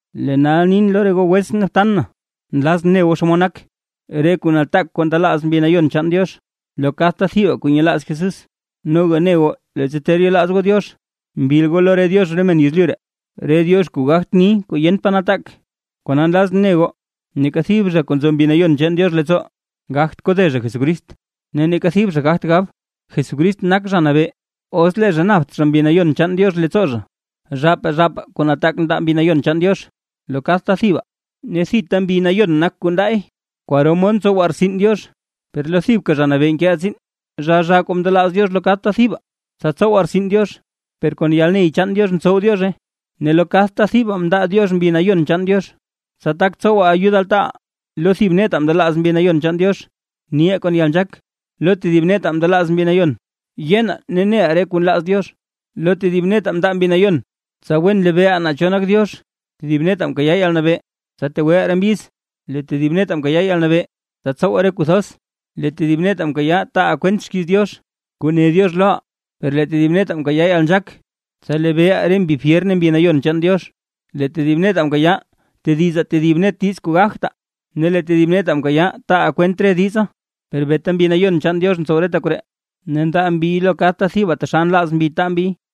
Lee nal nin lo re goo wetsʼn ne btan na, nlazʼn ne goo xomod nak, re kuu nataak kuu ndelaaz Mbi Nayon chaan Diox lo kadta thibaa kuu nyelaaz Jesús. Noga ne goo leettsa ter yelaaz goo Diox, mbil goo lo re diox re men yezlyu ree, re diox kuu gagt ni kuu yent pa nataak. Kona nlazʼn ne goo, neeka thib zha kuu nzo Mbi Nayon chaan Diox leettsoo, gagt kode zha Jesucrist. Ne neeka thib zha gagt gab: “Jesucrist nak Zha Nabee”, os lee zha napt zha Mbi Nayon chaan Diox leettsoo zha. Zhaapaa zhaapaa kuu nataak ndaa Mbi Nayon chaan Diox lo kadta thibaa, ne thita Mbi Nayon nak kuu ndaay. Kwaro mod ntsowaa rtsin Diox, per lo thibka Zha Nabee nkeʼaa tsiin. Zhaa zhaa kuu ndelaaz Diox lo kadta thibaa, tsa tsowaa rtsin Diox, per kon yalney chaan Diox ntsow Diozhe. Ne lo kadta thibaa mndaa Diox Mbi Nayon chaan Diox, tsa tak tsowaa ayud altaaʼaa. Lo thib netaa mndelaaz Mbi Nayon chaan Diox: niʼaa kon yalnzhaak, lo tedib netaa mndaa Mbi Nayon yenaa ne neʼaa re kuu nlaaz Diox. Lo tedib netaa mndaa Mbi Nayon, tsa wen lebeeʼaa naa cho nak Diox, tedib netaa mkayaa yalnabee, tsa tegweʼaa re mbyiz. Lee tedib netaa mkayaa yalnabee, tsa tsowaa re kuu thoz, lee tedib netaa mkayaa, taaʼaa kwent xkiiz Diox kuu ne Diox loʼaa, lee tedib netaa mkayaa yalnzhaak, tsa lebeeʼaa re mbi fyer ne Mbi Nayon chaan Diox, lee tedib netaa mkayaa tedizaa tedib net diiz kuu gagtaa, ne lee tedib netaa mkayaa taaʼaa kwent re diza. Per beeta Mbi Nayon chaan Diox ntsow reta koree, ne ndaa Mbiy lo kadta thibaa taxal nlaaz Mbi taa Mbiy.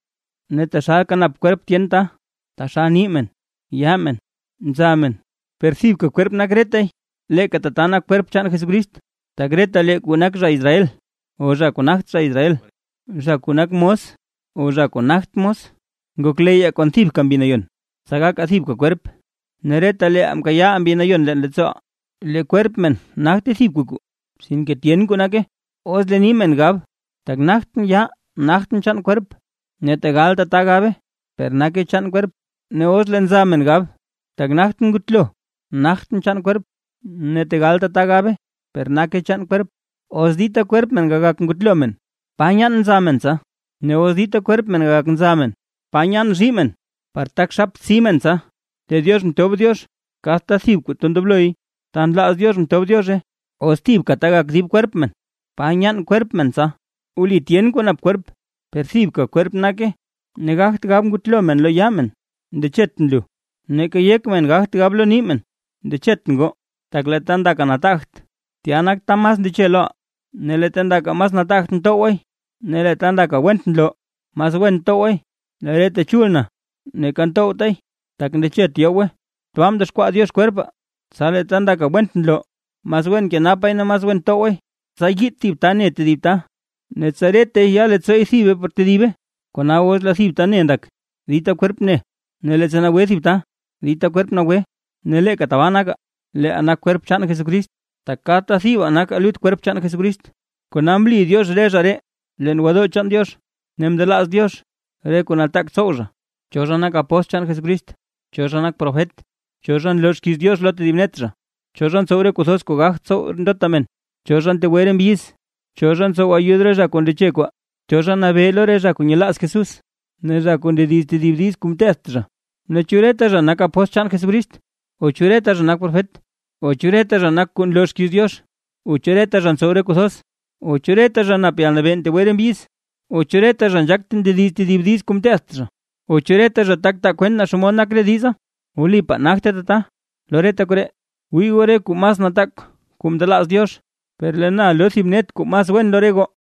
Ne taxalka nap kwerp men tyen ta; (taxal ni men, yaa men, nza men), per thibka kwerp nak retay. Leeka tata nak kwerp chaan Jesucrist. Tak retalee kuu nak zha Israel o zha kuu nagt zha Israel, zha kuu nak mos o zha kuu nagt mos, ngokleyyaa kon thibka Mbi Nayon, tsa gakaa thibka kwerp, ne retalee mkayaa Mbi Nayon leen leettsooʼaa. Lee kwerp men nagte thibka kuu, sinke tyen kuu nake. Os lee nii men gab: “Tak nagtʼn yaa, nagtʼn chaan kwerp”. Ne tegal tata gabe, per nake chaan kwerp. Ne os lee nza men gab: “Tak nagtʼn ngutlo, nagtʼn chaan kwerp”. Tegal tata gabe, per nake chaan kwerp. Os dita kwerp men gagak ngutlo men, ¿pa nyaan nza men tsa? Ne os dita kwerp men gagak nza men, ¿pa nyaan zhii men par tak xaptsi men tsa? Lee Diox mtob Diox kadta thib kuu ta ndobloy; ta nlaaz Diox mtob Diozhe. Os thibka ta gagak dib kwerp men, ¿pa nyaan kwerp men tsa? Wli tyen kuu nap kwerp, per thibka kwerp nake. Ne gagt gab ngutlo men lo yaa men: “Ndechetʼn lu”; neeka yek men gagt gab lo nii men: “Ndechetʼn goo”. Tak lee ta ndakaa nataagt, tya nak ta mas ndeche loʼaa. Ne lee ta ndakaa mas nataagt ntowgwaay. Ne lee ta ndakaa went nloo, mas wen ntowgwaay, lee re ta chul na neeka ntowtaay, tak ndechet yowgwe. Tbaa mdexkwaa Diox kwerpaa, tsa lee ta ndakaa went nloo, mas wen nkenapaay ne mas wen towgwaay, tsa yiit thib ta ne tedib ta, ne tsa retay ya leettsoo ne thibe por tedibe. Kona os lee thib ta ne ndak, dita kwerp ne; ne leettsa nagwe thib ta, dita kwerp nagwe. Ne leeka tabaa nakaa, leeʼaa nak kwerp chaan Jesucrist, tak kadta thibaa nakaa lut kwerp chaan Jesucrist. Kona mli Diox re zha ree, leen gwodoo chaan Diox ne mndelaaz Diox re kuu nataak tsow zha: cho zha nak apóstl chaan Jesucrist, cho zha nak profet, cho zha nloo xkiiz Diox lo tedib net zha, cho zha ntsow re kuu thoz kuu gagt tsow ndota men, cho zha ntegwe re mbyiz, cho zha ntsow ayud re zha kuu ndeche re kwaa, cho zha nabee lo re zha kuu nyelaaz Jesús, ne zha kuu ndediz tedib diiz kuu mteedt zha. Ne, ¿chu reta zha nak apóstl chaan Jesucrist? O ¿chu reta zha nak profet? O ¿chu reta zha nak kuu nloo xkiiz Diox? O ¿chu reta zha ntsow re kuu thoz? O ¿chu reta zha nap yalnabee ntegwe re mbyiz? O ¿chu reta zha nzhaak ndediz tedib diiz kuu mteedt zha? O ¿chu reta zha tak taa kwent naa xomod nak re diza? Wlipaa nagte tata. Lo reta koree, wii goo re kuu mas nataak kuu ndelaaz Diox. Per lee na loo thib net kuu mas wen lo re goo.